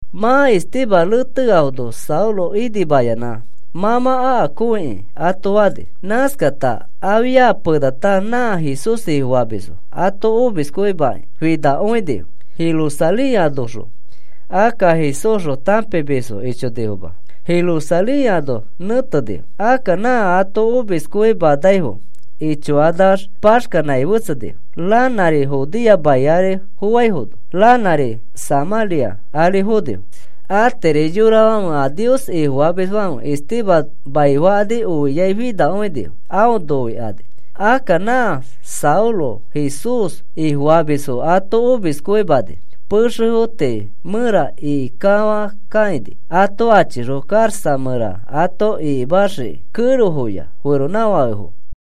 Mã Esteban reteafono Saulo inimayanã: “Mã mã akakõikĩ,” ato fani. Nãskata afia penata nã Jesús Ifofamisfo ato omiskõimakĩ finakõinifo Jerusalén anoxõ. Akka Jesúsxõ tãpimisfo ichonifoma, Jerusalén ano nẽtenifo. Akka nã ato omiskõimanaifo ichokanax paxkanãi fetsenifo. Ranãri Judea mai ari foaifono, ranãri Samãria ari fonifo. Atiri yorafãfe a Nios Ifofamisfãfe Esteban maifakani oiai finakõinifo aõ noikani. Akka nã Saulo Jesús Ifofamisfo ato omiskõimani pexefo tii mẽra ikikafãkakãini ato achixõ karaxa mẽra ato ikimaxiki, kẽrofoya feronãfakefo.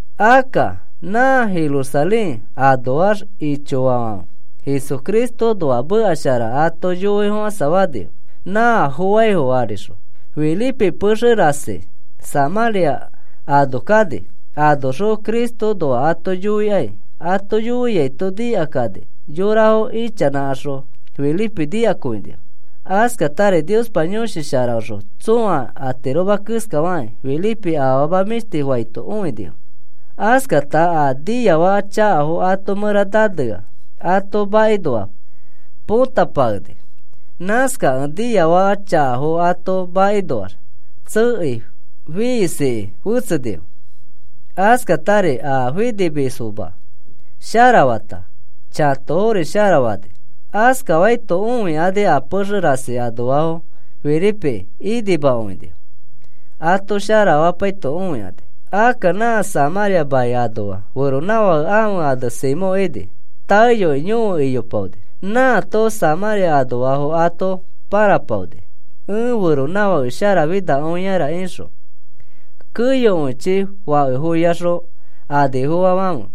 Akka nã Jerusalén anoax ichoafãfe Jesucristoõnoa meka shara ato yoifofãsafanifo nã foaifo arixõ. Felipe pexe rasi Samãria ano kani, anoxõ Cristoõnoa ato yoikai. Ato yoiaito nikakani yorafo ichanãkaxõ Felipe nikakõinifo. Askatari Niospa Yõshi Sharaõxõ tsõa atiroma keskafakĩ Felipe afama mĩshtifo faito õinifo. Askata a niafaka chakafo ato mẽra nanea ato makinoa potapakeni. Nãskakẽ niafaka chakafo ato makinoax tsekei fiisiki fetsenifo. Askatari a finimisfoma sharafata chãtofori sharafani. Askafaito õikani a pexe rasi anoafo Felipeki inimakõinifo, ato sharafapaito õikani. Akka nã Samãria mai anoa feronãfake ãfe ane Simón ini. Taeyoi yõfe iyopaoni, nãato Samãria anoafo ato pãrapaoni: “Ẽ feronãfake sharafinakõiara,” ixõ. Keyokõichi fakefoyaxõ anifofofãfe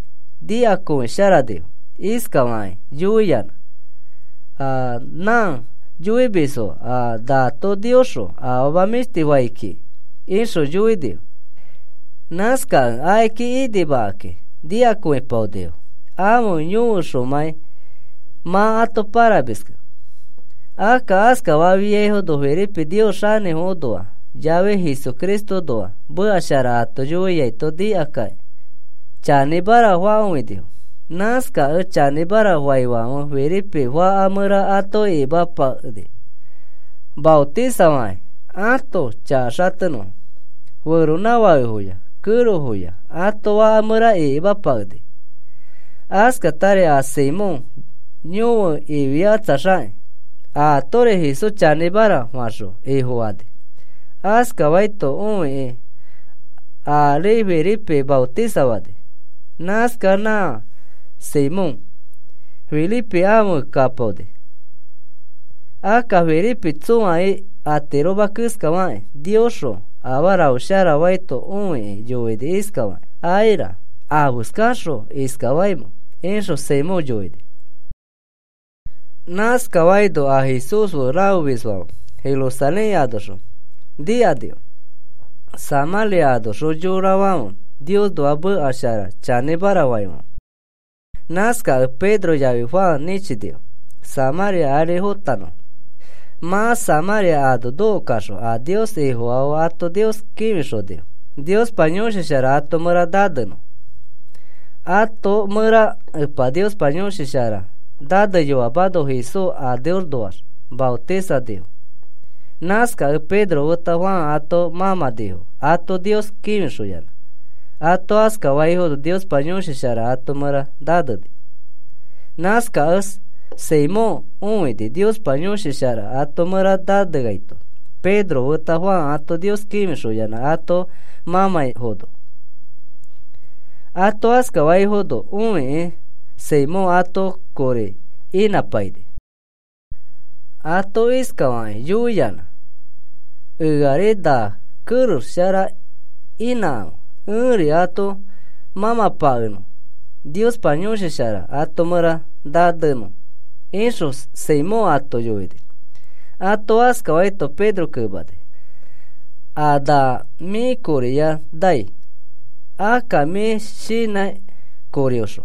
nikakõisharanifo iskafakĩ yoiyanã: “A nã yoimisfo a nato Niosxõ afama mĩshtifo fai kiki,” ixõ yoinifo. Nãskakẽ akiki inimakakĩ nikakõipaonifo ãfe yõfeõxomãi mã ato pãrapakemiskẽ. Akka askafiaifono Felipe Nios xanĩfoõnoa yafi Jesucristoõnoa meka shara ato yoiato nikakakĩ chanĩmara fakõinifo. Nãskakẽ chanĩmara faifãfe Felipe faka mẽra ato ikimapakeni maotisafakĩ ãto chaka xatenõfo. Feronãfakefoya kẽrofoya ato faka mẽra ikimapakeni. Askatari a Simón yõfe ifiakatsaxakĩ atori Jesús chanĩmara faxõ Ifofani. Askafaito õikĩ aari Felipe maotisafani. Nãskax nã Simón Felipe afe kapaoni. Akka Felipe tsõa atiroma keskafakĩ Niosxõ afarafo sharafaito õikĩ yoini iskafakĩ: “Aira. ¿Afeskaxõ iskafaimẽ?” ixõ Simón yoini. Nãskaifono a Jesús fe rafemisfãfe Jerusalén anoxõ nikanifo Samãria anoxõ yorafãfe Niosnoa meka shara chanĩmara faifãfe. Nãskakẽ Pedro yafi Juan nĩchinifo, Samãria ari fotanõfo. Mã Samãria ano nokokaxõ a Nios Ifofaafo ato Nios kĩfixonifo Niospa Yõshi Shara ato mẽra nanenõ. Ato mẽra Epa Niospa Yõshi Shara naneyoamano Jesús aneõnoax maotisanifo. Nãskakẽ Pedro feta Juan ato mãmãnifo ato Nios kĩfixoyanã. Ato askafaifono Niospa Yõshi Shara ato mẽra naneni. Nãskakẽ Simón õini Niospa Yõshi Shara ato mẽra naneaito Pedro feta Juan ato Nios kĩfixoyanã ato mãmãifono. Ato askafaifono õikĩ Simón ato kori inãpaini. Ato iskafakĩ yoiyanã: “Eari na kerex shara inãkãfe ẽri ato mãmãpakenõ Niospa Yõshi Shara ato mẽra nanenõ,” ixõ Simón ato yoini. Ato askafaito Pedro kemani: “A na mĩ koriya mĩ nai, akka mĩ shinã korioxõ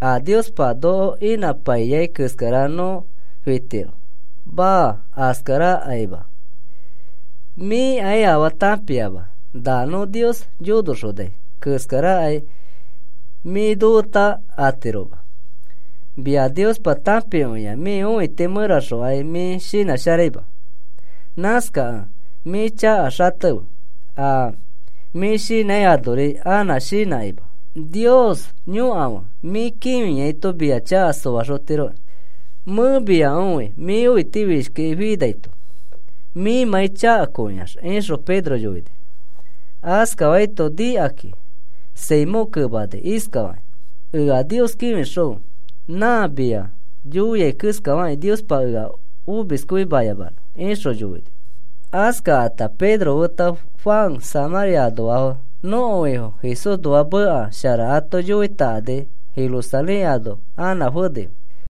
a Niospa noko inãpaiyai keskara nõ fitiro. Maa, askarakaima. Mĩkai afaa tãpiama na nõ Nios yonoxonai keskarakai mĩ nofeta atiroma. Mia Niospa tãpikõia mĩ õiti mẽraxokai mĩ shinãsharaima. Nãskakẽ mĩ chaka xatefe a mĩ shinãi anori anã shinãkima. Nios yõkafe mĩ kĩfiaito mia chaka soaxotiroki. Mẽ mia õi mĩ õitifishkiki finaito mĩmãi chakakõiax,” ixõ Pedro yoini. Askafaito nikakĩ Simón kemani iskafakĩ: “Ea Nios kĩfixõfe, nã mĩa yoiai keskafakĩ, Niospa ea omiskõimayamanõ,” ixõ yoini. Askakãta Pedro feta Juan Samãria anoafo nõko Ifo Jesúsnoa meka shara ato yoitakani Jerusalén ano anã fenifo.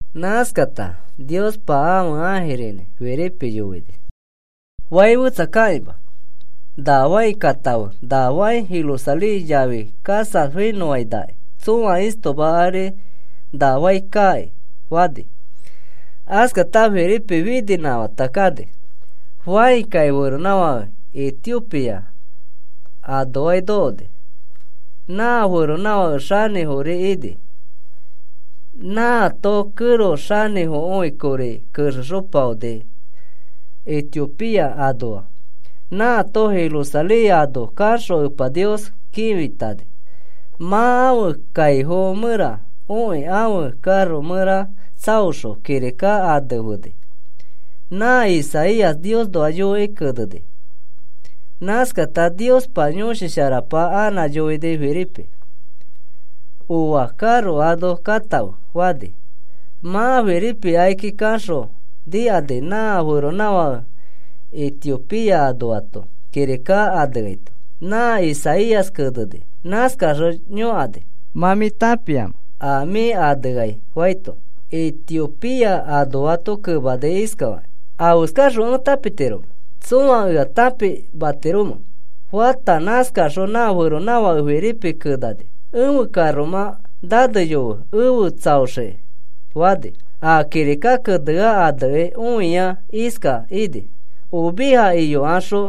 Nãskata Niospa ãfe ãjirinĩ Felipe yoini: “Fai fẽtsa kakĩma, na fãi katãfe na fãi Jerusalén yafi Gaza finõfainaki tsõa istoma ari na fai kaaki,” fani. Askata Felipe fininãkafãta kani. Fãi kai feronãfake Etiopía anoaki nokoni. Nã feronãfake xanĩfori ini. Nãato kẽro xanĩfokõi kori kexexopaoni Etiopía anoa. Nãato Jerusalén ano kaxõ Epa Nios kĩfitani. Mã ãfe kaifo mẽra okĩ ãfe karo mẽra tsaoxõ kirika anefeni, nã Isaías Niosnoa yoikĩ keneni. Nãskata Niospa Yõshi Sharapa anã yoini Felipe: “Oa karo ano katãfe,” fani. Mã Felipe akiki kaxõ nikani nã feronãfake Etiopía anoato kirika aneaito, nã Isaías keneni. Nãskaxõ yõkani: “¿Mã mĩ tãpiamẽ a mĩ aneai?” faito, Etiopía anoato kemani iskafakĩ: “¿Afeskaxõ ẽ tãpitiromẽ? ¿Tsõa ea tãpimatiromẽ?” fata nãskaxõ nã feronãfãke Felipe kenani: “Ẽfe karomã naneyofe efe tsaoxiki,” fani. A kirika kenea anekĩ õiai iska ini: Oveja iyokaxõ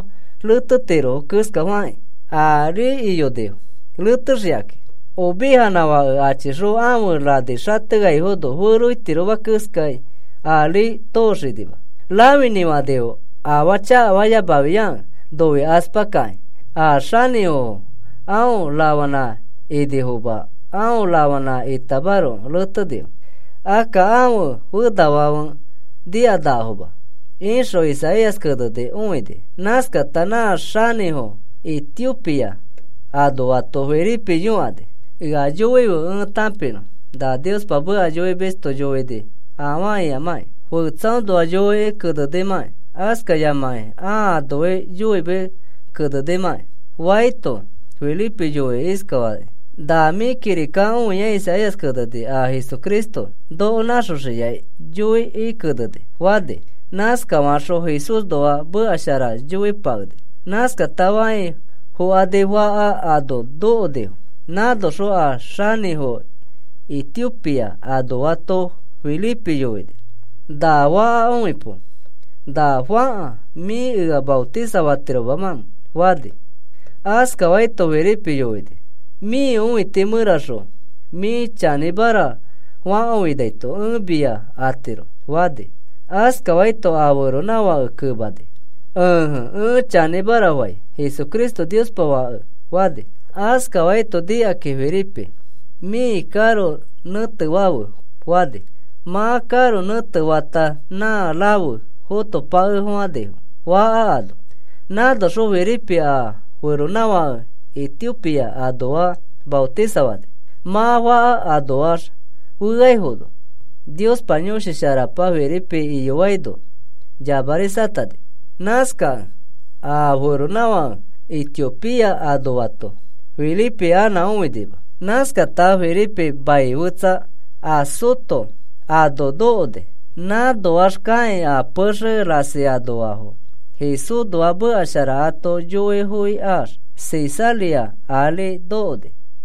retetirofo keskafakĩ, ari iyonifo retexikakĩ. Ovejanã fake achikaxõ ãfe rani xateaifono feroitiroma keskai ari tooxinima. Rãfinĩ fanifo afaa chakafayamafiakẽ noikaspa kakĩ. A xanĩfofo aõ rafanã inifoma aõ rafanã itamaroko retenifo. Akka ãfe fenafãfe nikanakafoma, ixõ Isaías keneni õini. Nãskata nã xanĩfo Etiopía anoato Felipe yõkani: “Ea yoife ẽ tãpinõ na Niospa meka yoimisto yoini afaa ikamãkĩ, fetsaõnoa yoikĩ kenenimãkĩ askayamakĩ ãa anoi yoimekĩ kenenimãkĩ,” faito, Felipe yoini iskafakĩ: “Na mĩ kirika õiai Isaías keneni a Jesucristo noko nãxoxiai yoikĩ keneni,” fani. Nãskafaxõ Jesúsnoa meka shara yoipakeni. Nãskakata fãi fokani faka ano nokonifo. Nãnoxõ a xanĩfo Etiopía anoato Felipe yoini: “Na faka õipo. ¿Na fãka mĩ ea maotisafatiromamẽ?” fani. Askafaito Felipe yoini: “Mĩ õiti mẽraxõ mĩ chanĩmara fakõinaito ẽ mia atiro,” fani. Askafaito a feronãfãke kemani: “Ẽje, ẽ chanĩmara fai Jesucristo Niospa Fake,” fani. Askafaito nikakĩ Felipe, “Mĩ karo nẽtefafe,” fani. Mã karo nẽtefakata nã rafe fotopakefofãnifo faka ano. Nãnoxõ Felipe a feronãfake Etiopía anoa maotisafani. Mã faka anoax feaifono, Niospa Yõshi Sharapa Felipe iyofaino yamarisatani. Nãskakẽ a feronãfake Etiopía anoato Felipe anã õinima. Nãskata Felipe mai fetsa, Azoto ano nokoni. Nãnoax kakĩ a pexe rasi anoafo Jesúsnoa meka shara ato yoifoikaax, Cesarea ari nokoni.